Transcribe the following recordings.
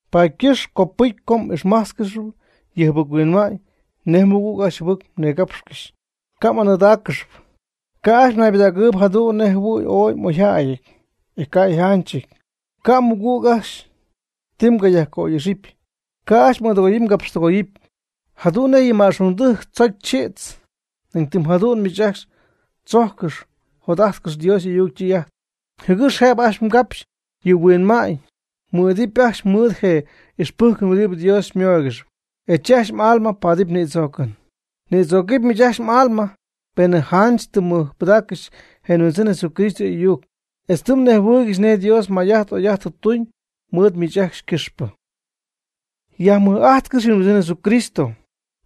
Paady ycɨxp copɨcy co m'ixmájtzcɨxɨpy yɨ jɨbɨc-huinma'ñ nej mɨgüg ajcxy jɨbɨc mnigapxcɨxy. Ca' m'anɨɨdáaccɨxɨpy. Ca' ajcxy mnaybɨdägɨɨyb jadu'n nej jɨhuɨ̈y ooy m'oyjäyɨty, e ca' yjanchɨty. Ca' mmɨgüg ajcxy ti myajca'oy'ixɨpy. Ca' ajcxy m'ɨɨdɨgoyɨpy mgapxtɨgoyɨpy. Jadu'n nej yɨ ma'xungdɨjc tzocy chïdz, nañ tɨm jadu'n miich ajcxy tzojccɨxy jot'ajtcɨxy Dios y'ayuc ytɨy'ajt, jɨgɨx jëbɨ ca'pxy yɨ mhuinma'ñ mɨ'idɨpy ajcxy mɨɨd je ixpɨjcɨn huɨdibɨ Dios xymooygɨxp, e chi ajcxy m'alma paadɨpy nïdzoocɨn. Nïdzögɨp miich ajcxy m'alma, penɨ janch tɨ mmɨjpɨdaaccɨxy je Huindzɨn Jesucristo y'ayuc, etz tɨ mnejhuɨɨygɨxy nej Dios may'ajt oy'ajt tɨ tuñ mɨɨd miich ajcxy ycɨxpɨ. Yajmɨj'ajtcɨx yɨ Huindzɨn Jesucristo.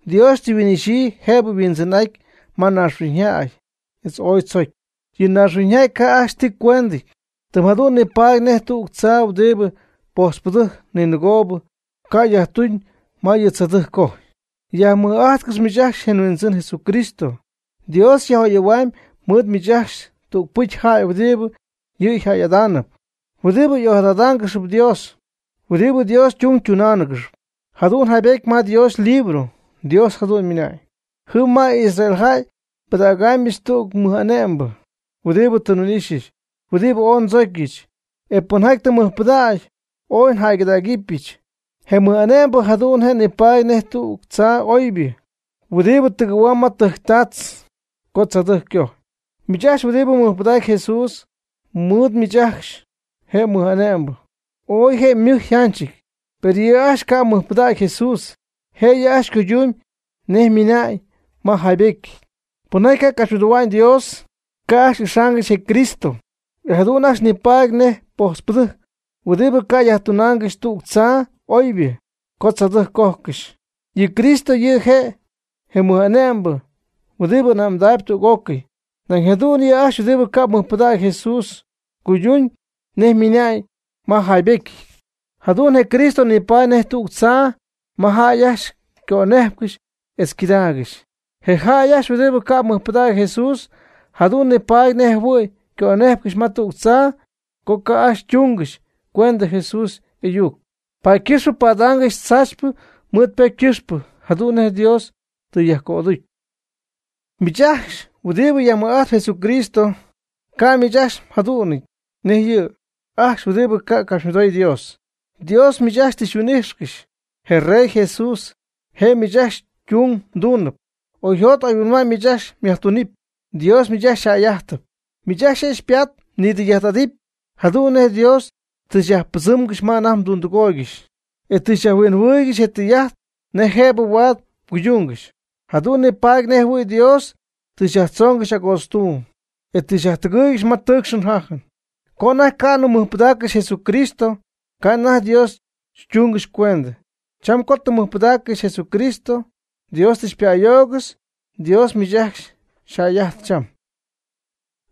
Dios tɨ yhuin'ixyii jëbɨ yHuindzɨn'aty ma naaxhuiñyjäy etz ooy tzocy. Yɨ naaxhuiñyjäy ca' ajcxy tɨ tuñcuend, tɨm jadu'n nipaady nej tüg tzaa huɨdibɨ pojtzpɨdɨjc ninɨgoob ca' yajtuna'ñ ma yɨ tzaadɨjc ycojy. Yajmɨj'ajtcɨx miich ajcxy je Huindzɨn Jesucristo. Dios yaj'oyɨ̈ huamyb mɨɨd miich ajcxy tügpɨcy jäy huɨdibɨ yɨ' yjäy'adaanɨp, huɨdibɨ ojadadaangɨxp Dios, huɨdibɨ Dios ytung tunaangɨxp. Jadu'n yjaybetyɨty ma Dios ylibro, Dios jadu'n ymɨna'ñ: Jɨm ma Israel jäy nbɨdägɨbɨch tüg mɨj'ane'mbɨ huɨdibɨ tɨ nhuin'ixyɨch, huɨdibɨ ooy ndzocyɨch, e pɨnjaty je' mɨjpɨdacp ooy njäygɨdägɨbɨch. Je mɨj'ame'mbɨ jadu'n je' nipaady nej tüg tzaa oybɨ huɨdibɨ tɨgɨ̈huamb ma tɨjctaatz co tzaadɨjc ycojy. Miich ajcxy huɨdibɨ mɨjpɨdacp Jesús, mɨɨd miich ajcxy je mɨj'ame'mbɨ ooy je' ymɨjɨty yjanchɨty. Per yɨ' ajcxy ca' mɨjpɨdägy Jesús, je' yɨ' ajcxy ycuydumyb nej ymɨna'ñ ma jaybetyɨty: Pɨnjaty ca' capxymɨdohua'ñ Dios, ca' ajcxy ixaangɨxy je Cristo, e jadu'n ajcxy nipaady nej pojtzpɨdɨjc huɨdibɨ ca' yajtunaangɨxy tüg tzaa oybɨ co tzaadɨjc cojcɨxy. Yɨ Cristo yɨ' je' je mɨj'ane'mbɨ huɨdibɨ ane'mdähuamb tüg'ócɨy. Nañ jadu'n yɨ' ajcxy huɨdibɨ ca' mɨjpɨdägy Jesús cuydumyb nej ymɨna'ñ ma yjaybetyɨty: Jadu'n je Cristo nipaady nej tüg tzaa ma jäy ajcxy ycönejpcɨxy etz ycɨdaagɨxy. Je jäy ajcxy huɨdibɨ ca' mɨjpɨdägy Jesús, jadu'n nipaady nej jɨhuɨ̈y ycönejpcɨxy ma tüg tzaa co ajcxy ca' tungɨxy cuendɨ Jesús y'ayuc, paady ycɨxpɨ padaangɨxy tzaachypɨ mɨɨd ypocy ycɨxpɨ, jadu'n nej Dios tɨ yajcöducy. Miich ajcxy huɨdibɨ yajmɨj'ajtp Jesucristo, ca' miich ajcxy mjadu'nɨty nej yɨ' ajcxy huɨdibɨ ca'capxymɨdoy Dios. Dios miich ajcxy tɨ xyhuin'ijxcɨxy. Je rey Jesús je' miich ajcxy ytung mduunɨp. Oyjot oyhuinma'ñ miich ajcxy myajtumyb. Dios miich ajcxy xyjäy'ajtɨp. Miich ajcxy je' xypaat mnidɨy'ajt'adɨpy jadu'n nej Dios tɨ xyajpɨdzɨmgɨxy ma anajty mdundɨgooygɨxy, e tɨ xyajhuinjɨhuɨɨygɨxy je' ytɨy'ajt nej jëb huaad mguydungɨxy. Jadu'n nipaady nej jɨhuɨ̈y Dios tɨ xyajtzoongɨxy agootztuuyb, e tɨ xyajtɨgɨɨygɨxy ma ytɨɨcxy yjajy. Co anajty ca'nɨ mmɨjpɨdaaccɨxy Jesucristo, ca' anajty Dios xytungɨxy cuendɨ. Cham co tɨ mmɨjpɨdaaccɨxy Jesucristo, Dios tɨ xypa'ayoogɨxy. Dios miich ajcxy xyjäy'ajtp cham.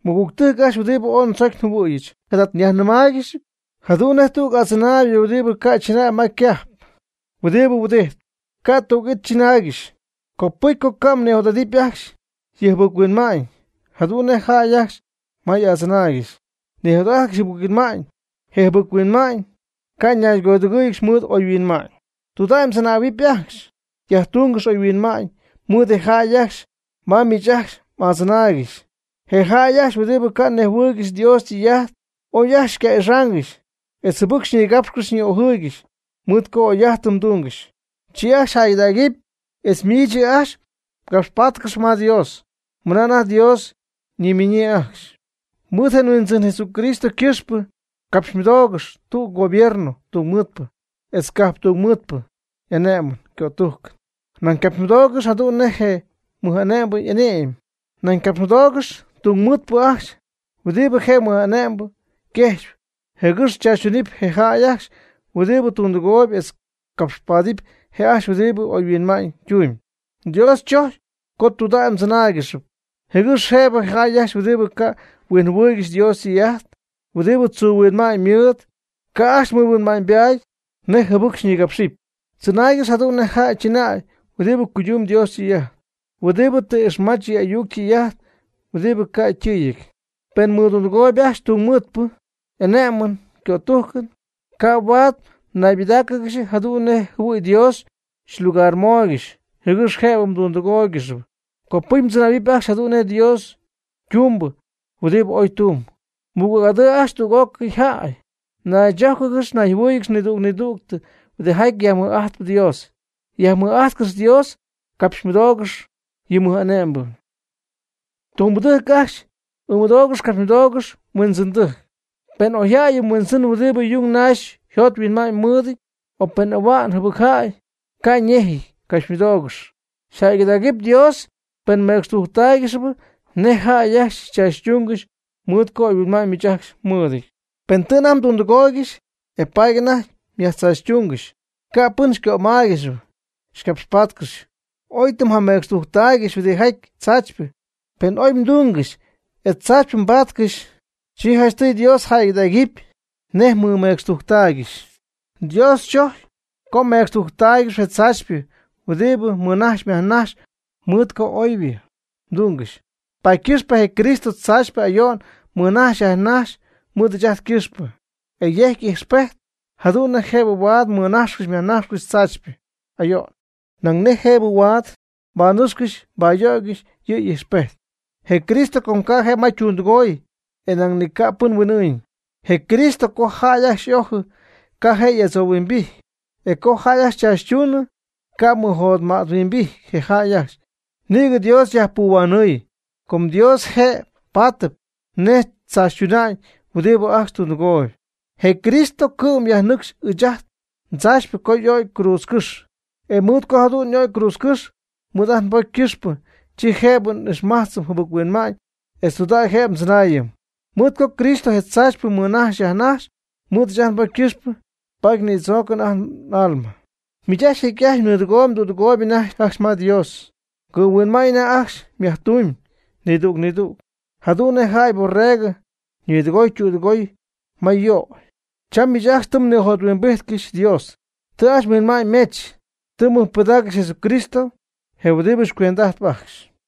Mɨgügtɨjc ajcxy huɨdibɨ ooy ndzocy njɨhuɨ̈yɨch, jada nyajnɨmaaygɨxyp, jadu'n nej tüg adzɨnaaybɨ huɨdibɨ ca' chɨnäy ma ycajp, huɨdibɨ nihuɨdijtp, ca' tüg it mdzɨnaaygɨxy, copɨcy co ca' mnijot'adɨpy ajcxy yɨ jɨbɨc-huinma'ñ, jadu'n nej je jäy ajcxy ma m'adzɨnaaygɨxy nijot'ajtcɨxy jɨbɨc-huinma'ñ. Je jɨbɨc-huinma'ñ ca' ñaygodɨgɨ́ɨyɨgɨxy mɨɨd oyhuinma'ñ. Tɨydudägy mdzɨnähuɨpy ajcxy, yajtúngɨx oyhuinma'ñ mɨɨd je jäy ajcxy ma miich ajcxy m'adzɨnaaygɨxy, je jäy ajcxy huɨdibɨ ca' nejhuɨɨygɨxy Dios ytɨy'ajt. Oy ajcxy ca' xy'ixaangɨxy etz jɨbɨc xyñigapxcɨxy xyñi'ojɨɨygɨxy, mɨɨd co oyjäy'ajtɨn mdungɨxyp, chi ajcxy jäygɨdägɨpy, etz miich yɨ' ajcxy xycapxpátcɨxɨpy ma Dios, mɨna anajty Dios ñinmiñyii ajcxy. Mɨɨd je Huindzɨn Jesucristo ycɨxpɨ, capxymɨdoogɨxy tüg'ócɨy gobierno tungmɨɨdpɨ etz cajp tungmɨɨdpɨ y'ane'mɨn ycötujcɨn, nañ capxymɨdoogɨxy jadu'n nej je mɨj'ane'mbɨ y'ane'my. Nañ capxymɨdoogɨx tungmɨɨdpɨ ajcxy huɨdibɨ je mɨj'ane'mbɨ yquejxyp jɨgɨx tzaachytunɨpy je' ajcxy huɨdibɨ tundɨgooyb etz capxpaadɨpy je' ajcxy huɨdi oyhuinma'ñ ytumyb. Dios chojcyp co tɨydudägy mdzɨnáaygɨxɨpy, jɨgɨx jëbɨ je jäy ajcxy huɨdibɨ ca' huinjɨhuɨɨygɨxy Dios ytɨy'ajt, huɨdibɨ tzuu huinma'ñ mɨɨd, ca' ajcxy mɨhuinma'ñybaady nej jɨbɨc xyñigapxɨp. Tzɨnaaygɨx jadu'n nej jäy chɨnäy huɨdibɨ cuydumb Dios ytɨy'ajt, huɨdibɨ tɨ ixmach yɨ ayuc tɨy'ajt huɨdibɨ ca' ytɨɨyɨty. Pen mmɨdundɨgooyb ajcxy tunmɨɨdpɨ y'ane'mɨn ycötujcɨn, ca' huaad mnaybɨdáacɨgɨxy jadu'n nej jɨhuɨ̈y Dios xylugarmooygɨxy jɨgɨx jëbɨ mdundɨgooygɨxy. Copɨcy mdzɨnähuɨpy ajcxy jadu'n nej Dios ytumbɨ huɨdibɨ oy tumb. Mɨgüg'adɨɨ ajcxy tüg'ócɨy jäy. Naychójcɨgɨx nayjɨhuɨ́ɨyɨgɨx nidüg nidüg huɨdijaty yajmɨj'ajtp Dios. Yajmɨj'ajtcɨx Dios. Capxymɨdoogɨx yɨ mɨj'ane'mbɨ. Tumbɨdɨjc ajcxy, ɨɨmɨdoogɨx capxymɨdoogɨx mhuindzɨndɨjc. Pen oyjäy yɨ mhuindzɨn huɨdibɨ yung naxy yjot yhuinma'ñ mɨɨdɨty, o pen ahua'njäy jɨbɨcjäy, ca' yñejɨty, capxymɨdoogɨx. Yjäygɨdägɨpy Dios pen mmecxtujctaaygɨxyp nej jäy ajcxy xychaachytúngɨxy mɨɨd co oyhuinma'ñ miich ajcxy mmɨɨdɨty. Pen tɨ anajty mdundɨgooygɨxy, e paady anajty myajtzaachytungɨxy, ca' pɨn xycömáaygɨxɨpy xycapxpáadygɨxɨpy, oy tɨ mjamecxtujctaaygɨxy huɨdijaty tzaachypɨ. Pen ooy mdungɨxy etz tzaachypɨ mbaatcɨxy, chi janchtɨy Dios jäygɨdägɨpy nej mmɨmecxtujctaaygɨxy. Dios chojcpy co mmecxtujctáaygɨxɨpy je tzaachypɨ huɨdibɨ mmɨnajxyp myajnajxcɨxyp mɨɨd co oybɨ mdungɨxy. Paady ycɨxpɨ je Cristo tzaachypɨ ayo'n mɨnajxy yajnajxy mɨɨd ɨɨch ajt ycɨxpɨ, e yejc ijxpejt jadu'n nej jëbɨ huaad mmɨnajxcɨxy myajnajxcɨxy tzaachypɨ ayo'n, nañ nej jëbɨ huaad mbanɨcxcɨxy mbayöygɨxy yɨ' y'ijxpejt. Je Cristo ca' je' ma ytundɨgooy, e nañ ca' pɨn huin'ɨɨñ. Je Cristo co jäy ajcxy y'ojɨ, ca' je' y'adzouhuimbijty; e co jäy ajcxy chaachytuunɨ, ca' mɨjotmäthuimbijty je jäy ajcxy, nïgɨ Dios yajpuhuanɨɨy. Com Dios je' paatɨp nej chaachytuna'ñ huɨdi ajcxy tundɨgooyb. Je Cristo cɨ'm yajnɨcx ɨɨch ajt ndzaachypɨ co y'o'cy cruudzcɨ́xy. E mɨɨd co jadu'n y'o'cy cruudzcɨ́xy mɨɨd ajt nbocy ycɨxpɨ, chi jëbɨ n'ixmajtzɨm jɨbɨc-huinma'ñ etz tudägy jëbɨ ndzɨnaayɨm. Mɨɨd co Cristo je tzaachypɨ mɨnajxy yajnajxy mɨɨd ɨɨch ajt nbocy ycɨxpɨ, paady nïdzoocɨm ajt n'alma. Miich ajcxy jecy'ajt mnɨɨdɨgooyb mdüdɨgooyb anajty ajcxy ma Dios, mgɨ'mhuinma'ñ anajty ajcxy myajtumyb nidüg nidüg, jadu'n nej jäy yborregɨ ñɨɨdɨgoy ytüdɨgoy ma yuugjot. Cham miich ajcxy tɨ mnijothuimbijtcɨxy Dios, tɨ ajcxy mhuinma'ñymech tɨ mmɨjpɨdaaccɨxy Jesucristo je huɨdibɨ xycuend'ajtp ajcxy.